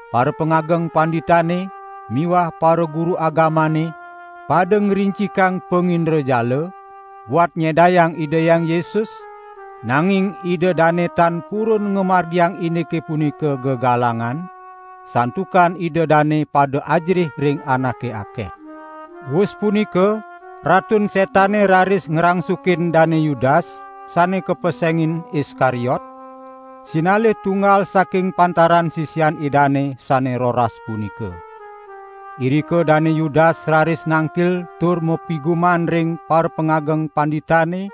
Parapangageng panditane miwah paraguru agamane pada ngrincikang pangindrajala, buat nyedayang Ida Hyang Yesus, nanging ida dane tan purun ngamargiang indike punika gegalangan, santukan ida dane pada ajerih ring anake akeh. Wus punika Ratun Setane raris ngrangsukin Dane Yudas sane kapesengin Iskariot, sinalih tunggal saking pantaran sisian Idane sane roras punika. Irika Dane Yudas raris nangkil tur mapiguman ring parapangageng panditane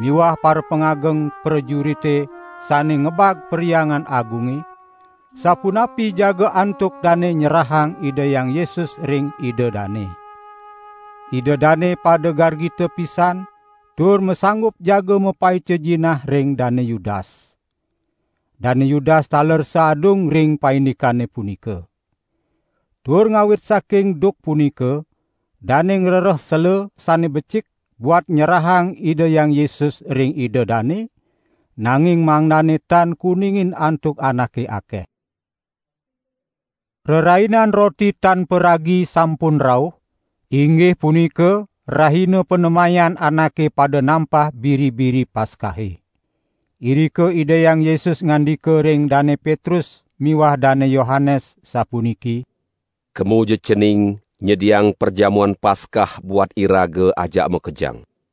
miwah parapangageng prajurite sane ngebag Perhyangan Agunge, sapunapi jaga antuk dane nyerahang Ida Hyang Yesus ring ida dane. Ida dane pada gargita pisan tur masanggup jaga mapaica jinah ring Dane Yudas. Dane Yudas taler saadung ring paindikane punika. Tur ngawit saking duk punika, dane ngrereh sela sane becik buat nyerahang Ida Hyang Yesus ring ida dane, nanging mangdane tan kuningin antuk anake akeh. Rerainan Roti Tan Paragi sampun rauh, inggih punika rahina panemayan anake pada nampah biri-biri Paskahe. Irika Ida Hyang Yesus ngandika ring Dane Petrus miwah Dane Yohanes sapuniki: "Kemaja cening nyediang Perjamuan Paskah buat iraga ajak makejang!"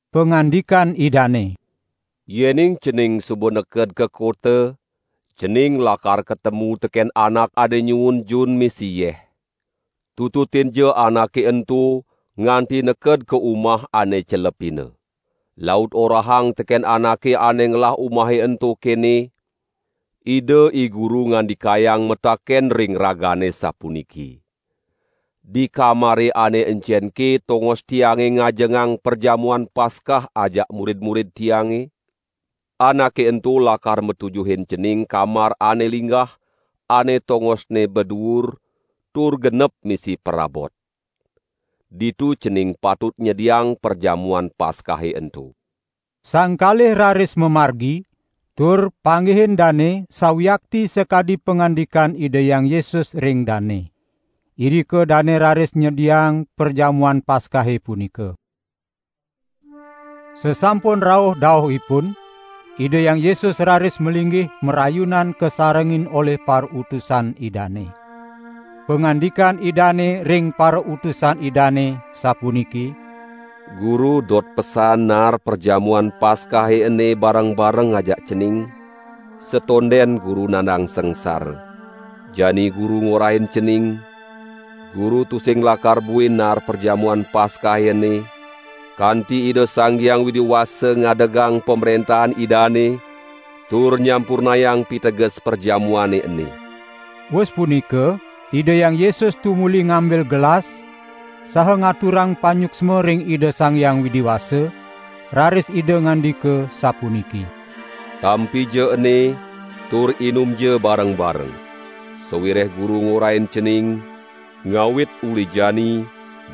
Pangandikan Idane: "Yening cening suba neked ka kota, cening lakar katemu teken anak ane nyuun jun misi yeh. Tututinja anake ento nganti neked ka umah ane celepina. Laut orahang teken anake ane ngelah umahe ento kene: 'Ida IGuru ngandikayang mataken ring ragane sapuniki: Di kamare ane encenke tongos Tiange ngajengang Perjamuan Paskah ajak murid-murid Tiange?' Anake ento lakar matujuhin cening kamar ane linggah ane tongosne baduur, tur genep misi prabot. Ditu cening patut nyediang Perjamuan Paskahe ento." Sang kalih raris mamargi, tur panggihin dane sawiakti sakadi pangandikan Ida Hyang Yesus ring dane. Irika dane raris nyediang Perjamuan Paskahe punika. Sasampun rauh dauhipun, Ida Hyang Yesus raris malinggih marayunan kasarengin olih parautusan Idane. Pangandikan Idane ring parautusan Idane sapuniki: "Guru dot pesan naar Perjamuan Paskahe ene bareng-bareng ajak cening, satonden Guru nandang sangsara. Jani Guru ngorahin cening, Guru tusing lakar buin naar Perjamuan Paskahe ene, kanti Ida Sang Hyang Widi Wasa ngadegang Pamrentahan Idane, tur nyampurnayang piteges perjamuane ene." Wus punika Ida Hyang Yesus tumuli ngambil gelas, saha ngaturang panyuksma ring Ida Sang Hyang Widi Wasa, raris Ida ngandika sapuniki: "Tampija ene, tur inumja bareng-bareng. Sawireh Guru ngorahin cening: Ngawit uli jani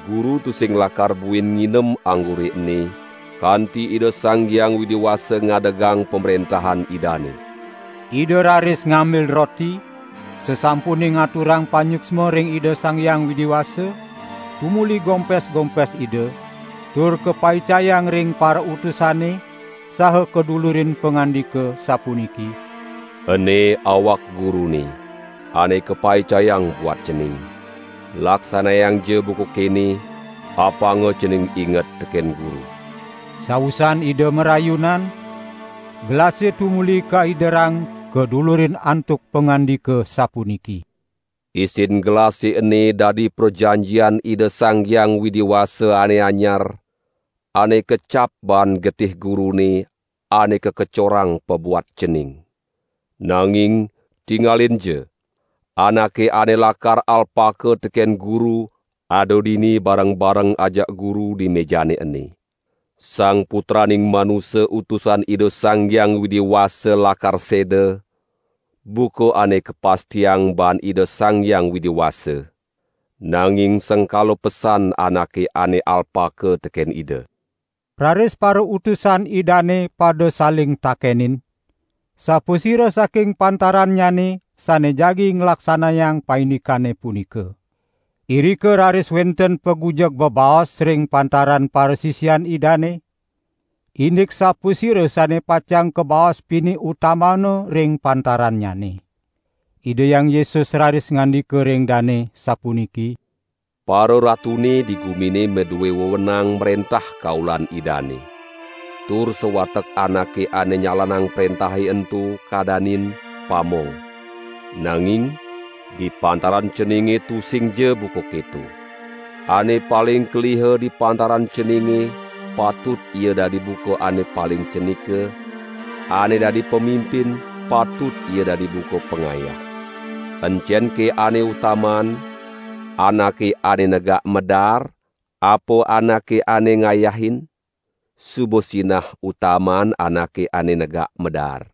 Guru tusing lakar buin nginem anggure ene, kanti Ida Sang Hyang Widi Wasa ngadegang Pamrentahan Idane." Ida raris ngambil roti, sasampune ngaturang panyuksma ring Ida Sang Hyang Widi Wasa, tumuli gompes-gompes Ida, tur kapaicayang ring parautusane, saha kadulurin pangandika sapuniki: "Ene awak Gurune (ane kapaicayang buat cening. Laksanayangja buka kene, apanga cening inget teken Guru." Sawusan Ida marayunan, gelase tumuli kaiderang kadulurin antuk pangandika sapuniki: "Isin gelase ene dadi prajanjian Ida Sang Hyang Widi Wasa ane anyar, ane kacap baan getih Gurune ane kakecorang pabuat cening). Nanging tingalinja! Anake ane lakar alpaka teken Guru, ada dini bareng-bareng ajak Guru di mejane ene. Sang Putraning Manusa Utusan Ida Sang Hyang Widi Wasa lakar seda, buka ane kapastiang baan Ida Sang Hyang Widi Wasa. Nanging sengkala pesan anake ane alpaka teken Ida." Raris parautusan Idane pada saling takenin, sapasira saking pantarannyane sane jagi nglaksanayang paindikane punika. Irika raris wenten pagujeg bebaos ring pantaran parasisian Idane, indik sapasira sane pacang kabaos pinih utamana ring pantarannyane. Ida Hyang Yesus raris ngandika ring dane, sapuniki: "Pararatune di gumine madue wewenang mrentah kaulan idane. Tur sawatek anake ane nyalanang prentahe ento kadanin: pamong. Nanging di pantaran ceninge tusingja buka keto. Ane paling keliha di pantaran ceninge patut ia dadi buka ane paling cenika, ane dadi pamimpin, patut ia dadi buka pangayah. Encenke ane utamaan: anake ane negak madaar, apa anake ane ngayahin? Suba sinah utamaan anake ane negak madaar.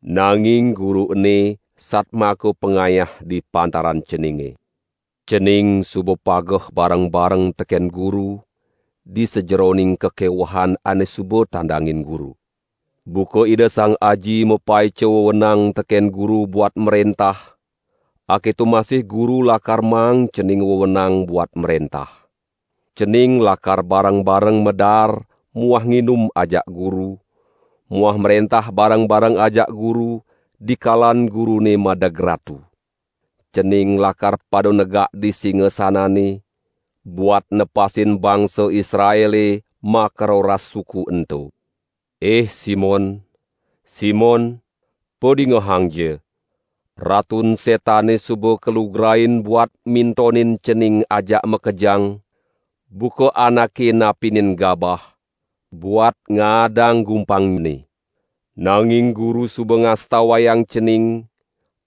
Nanging Guru ene satmaka pangayah di pantaran ceninge. Cening suba pageh bareng-bareng teken Guru di sajeroning kakewehan ane suba tandangin Guru. Buka Ida Sang Aji mapaica wewenang teken Guru buat mrentah, aketo masih Guru lakar maang cening wewenang buat mrentah. Cening lakar bareng-bareng madaar muah nginum ajak Guru muah mrentah bareng-bareng ngajak Guru dikalan Gurune madeg Ratu. Cening lakar pada negak di singasanane, buat nepasin bangsa Israele makaroras suku ento." "Ih Simon, Simon, padingehangja! Ratun Setane suba kalugrain buat mintonin cening ajak makejang, buka anake napinin gabah, buat ngaadang gumpangne. Nanging Guru suba ngastawayang cening,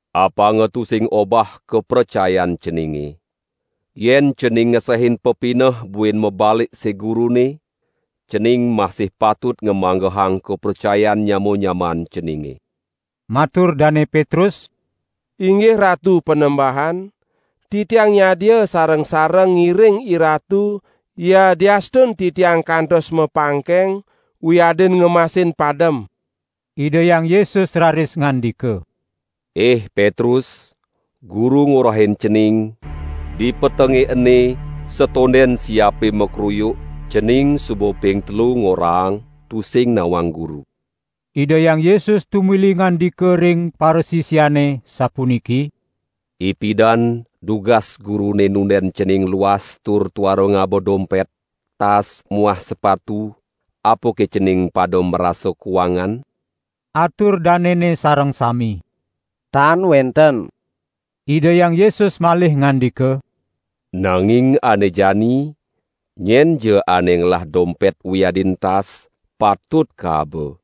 apanga tusing obah kapracayan ceninge. Yen cening ngesehin pepineh buin mabalik sig Gurune, cening masih patut ngamanggehang kapracayan nyama-nyamaan ceninge!" Matur Dane Petrus: "Inggih Ratu Panembahan, titiang nyadia sareng-sareng ngiring IRatu yadiastun titiang kantos mapangkeng wiadin ngemasin padem." Ida Hyang Yesus raris ngandika: "Ih Petrus, Guru ngorahin cening, dipetenge ene, satonden siape makruyuk, cening suba ping telu ngorahang tusing nawang Guru." Ida Hyang Yesus tumuli ngandika ring parasisiane, sapuniki: "Ipidan dugas Gurune nunden cening luas tur tuara ngaba dompet, tas muah sepatu apake cening pada marasa kuangan?" Atur danene sareng sami: "Tan wenten." Ida Hyang Yesus malih ngandika: "Nanging ane jani, nyenja ane ngelah dompet wiadin tas, patut kaaba.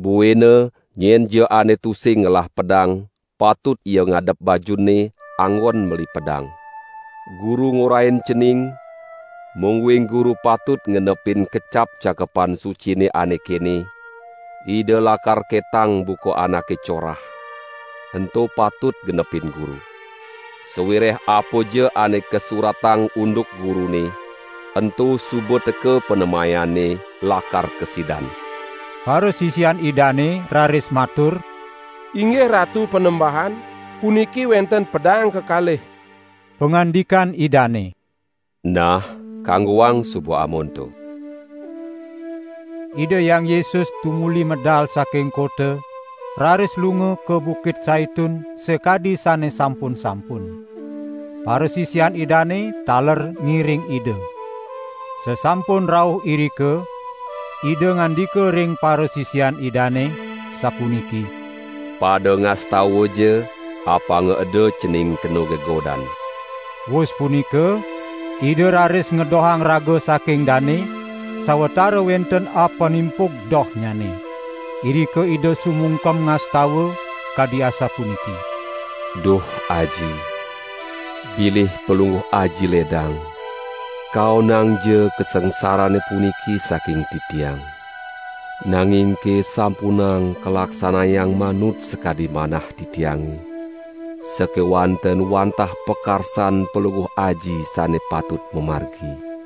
Buina nyenja ane tusing ngelah pedang patut ia ngadep bajunne anggon meli pedang. Guru ngorahin cening, mungguing Guru patut ngenepin kecap Cakepan Sucine ane kene: 'Ida lakar ketang buka anake corah,' ento patut genepin Guru. Sawireh apaja ane kasuratang unduk Gurune, ento suba teka panemayanne lakar kasidan." Parasisian Idane raris matur: "Inggih Ratu Panembahan! Puniki wenten pedang kekalih." Pangandikan Idane: "Nah, kanggoang suba amonto." Ida Hyang Yesus tumuli medal saking kota, raris lunga ka Bukit Saitun sakadi sane sampun-sampun. Parasisian Idane taler ngiring Ida. Sasampun rauh irika Ida ngandika ring parasisian Idane, sapuniki: "Pada ngastawaja, apanga eda cening kena gegodan!" Wus punika, Ida raris ngedohang raga saking dane, sawatara wenten apanimpug dohnyane. Irika Ida sumungkem ngastawa, kadi asapuniki: "Duh Aji, bilih Palungguh Aji ledang, kaonangja kasangsarane puniki saking Titiang. Nangingke sampunang kalaksanayang manut sakadi manah Titiange, sakewanten wantah pakarsan Palungguh Aji sane patut mamargi." (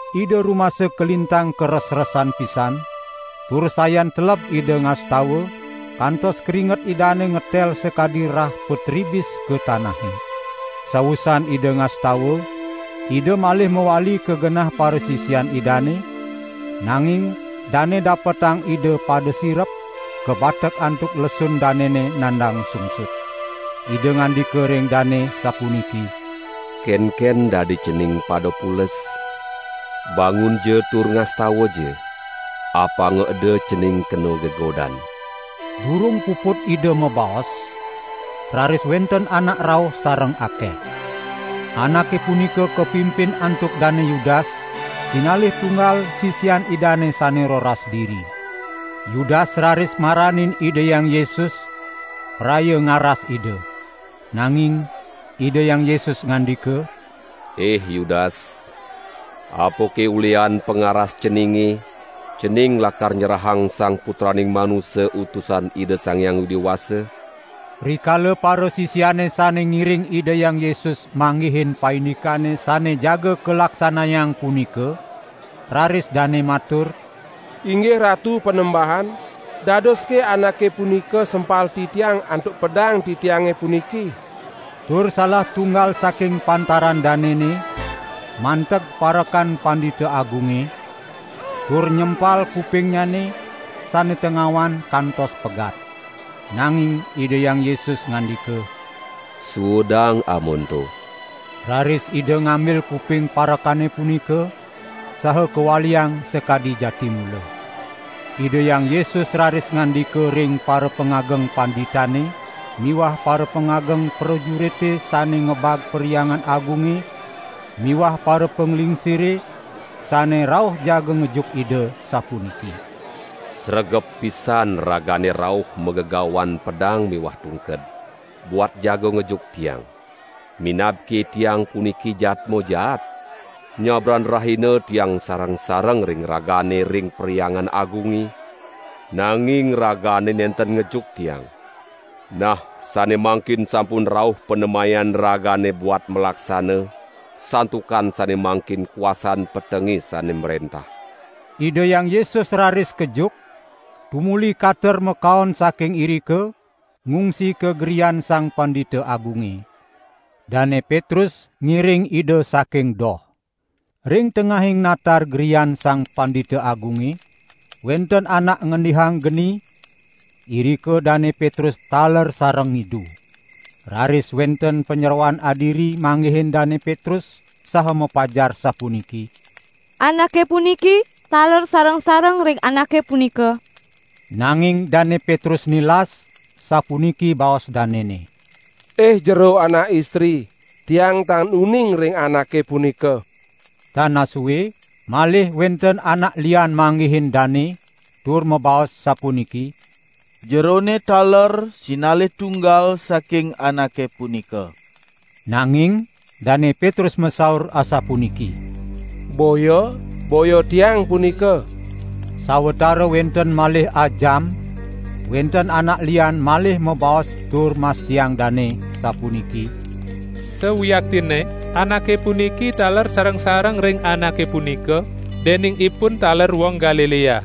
Ida rumasa kalintang karesresan pisan, tur sayan teleb Ida ngastawa, kantos kringet Idane ngetel sakadi rah patribis ka tanahe.) Sawusan Ida ngastawa, Ida malih mawali ka genah parasisian Idane, nanging dane dapetang Ida pada sirep, kabatek antuk lesun danene nandang sungsut. Ida ngandika ring dane sapuniki: "Kenken dadi cening pada pules? Bangunja tur ngastawaja, apanga eda cening kena gegodan." Durung puput Ida mabaos, raris wenten anak rauh sareng akeh. Anake punika kapimpin antuk Dane Yudas, sinalih tunggal sisian Idane sane roras diri. Yudas raris maranin Ida Hyang Yesus, praya ngaras Ida. Nanging Ida Hyang Yesus ngandika: "Ih Yudas, apake ulihan pangaras ceninge, cening lakar nyerahang Sang Putraning Manusa Utusan Ida Sang Hyang Widi Wasa?" Rikala parasisiane sane ngiring Ida Hyang Yesus manggihin paindikane sane jaga kalaksanayang punika, raris dane matur: "Inggih Ratu Panembahan! Dadoske anake punika sempal titiang antuk pedang titiange puniki?" Tur salah tunggal saking pantaran danene, manteg parekan Pandita Agunge tur nyempal kupingnyane sane tengawan kantos pegat. Nanging Ida Hyang Yesus ngandika: "Suudang amonto." Raris Ida ngambil kuping parekane punika saha kawaliang sakadi jati mula. Ida Hyang Yesus raris ngandika ring parapangageng panditane miwah parapangageng prajurite sane ngebag Perhyangan Agunge miwah parapanglingsire sane rauh jaga ngejuk Ida, sapuniki: "Sregep pisan ragane rauh magegawan pedang miwah tungked, buat jaga ngejuk Tiang. Minabke Tiang puniki jadma jaat? Nyabran rahina Tiang sareng-sareng ring ragane ring Perhyangan Agunge, nanging ragane nenten ngejuk Tiang. Nah, sane mangkin sampun rauh panemayan ragane buat malaksana, santukan sane mangkin kuasan petenge sane mrentah." Ida Hyang Yesus raris kejuk, tumuli kater makaon saking irika, ngungsi ka grian Sang Pandita Agunge. Dane Petrus ngiring Ida saking doh. Ring tengahing natar grian Sang Pandita Agunge, wenten anak ngendihang geni, irika Dane Petrus taler sareng ngidu. Raris wenten panyeroan adiri manggihin Dane Petrus saha mapajar sapuniki: "Anake puniki taler sareng-sareng ring Anake punika!" Nanging Dane Petrus nilas, sapuniki baos danene: "Ih jero anak istri, tiang tan uning ring Anake punika." Tan asue, malih wenten anak lian manggihin dane, tur mabaos sapuniki: "Jerone taler sinalih tunggal saking Anake punika!" Nanging Dane Petrus masaur asapuniki: "Boya, boya tiang punika!" Sawatara wenten malih ajam, wenten anak lian malih mabaos tur mastiang dane, sapuniki: "Sawiaktinne, anake puniki taler sareng-sareng ring Anake punika, dening ipun taler wong Galilea!"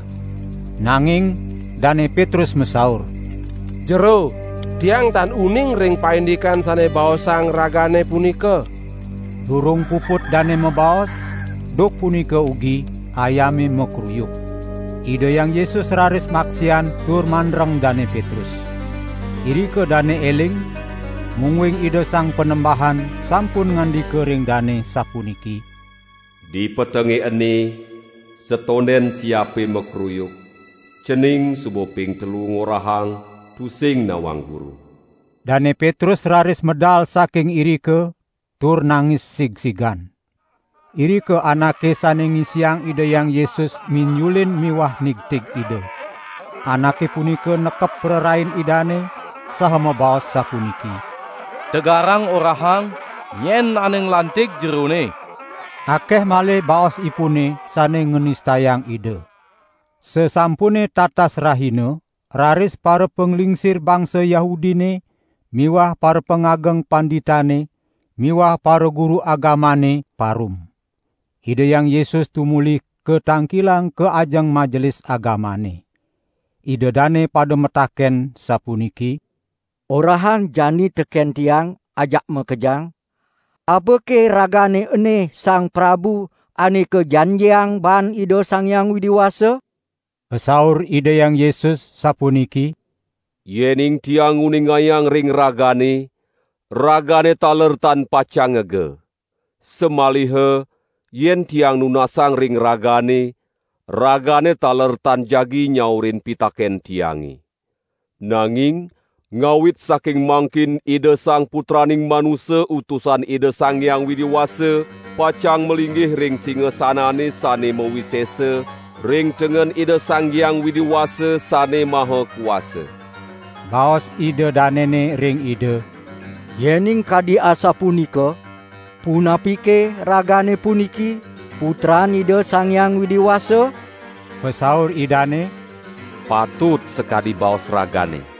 Nanging Dane Petrus masaur: "Jero, tiang tan uning ring paindikan sane baosang ragane punika!" Durung puput dane mabaos, duk punika ugi, ayame makruyuk. Ida Hyang Yesus raris maksian tur mandreng Dane Petrus. Irika dane eling, mungguing Ida Sang Panembahan sampun ngandika ring dane sapuniki: "Dipetenge ene, satonden siape makruyuk cening suba ping telu ngorahang tusing nawang Guru." Dane Petrus raris medal saking irika tur nangis sigsigan. Irika anake sane ngisiang Ida Hyang Yesus minjulin miwah nigtig Ida. Anake punika nekep prarain Idane saha mabaos sapuniki: "Tegarangja orahang, nyen ane nglantig Jerone?" Akeh malih baosipune sane nganistayang Ida. Sasampune tatas rahina raris parapanglingsir bangsa Yahudine miwah parapangageng panditane miwah paraguru agamane parum. Ida Hyang Yesus tumuli katangkilang ka ajeng Majelis Agamane. Ida dane pada mataken sapuniki: "Orahang jani teken tiang ajak makejang, apake Ragane ene Sang Prabu Ane Kajanjiang baan Ida Sang Hyang Widi Wasa?" Pasaur Ida Hyang Yesus sapuniki: "Yening Tiang nguningayang ring ragane, ragane taler tan pacang ngega. Samaliha yen Tiang nunasang ring ragane, ragane taler tan jagi nyaurin pitaken Tiange. Nanging ngawit saking mangkin Ida Sang Putraning Manusa Utusan Ida Sang Hyang Widi Wasa pacang malinggih ring singasanane sane mawisesa ring tengen Ida Sang Hyang Widi Wasa Sane Maha Kuasa." Baos ida danene ring Ida: "Yening kadi asapunika, punapike Ragane puniki Putran Ida Sang Hyang Widi Wasa?" Pasaur Idane: "Patut sakadi baos ragane!"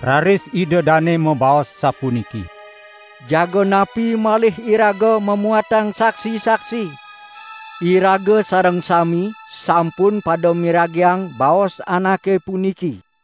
Raris ida dane mabaos sapuniki: "Jaga napi malih iraga mamuatang saksi-saksi, iraga sareng sami sampun pada miragiang baos Anake puniki!"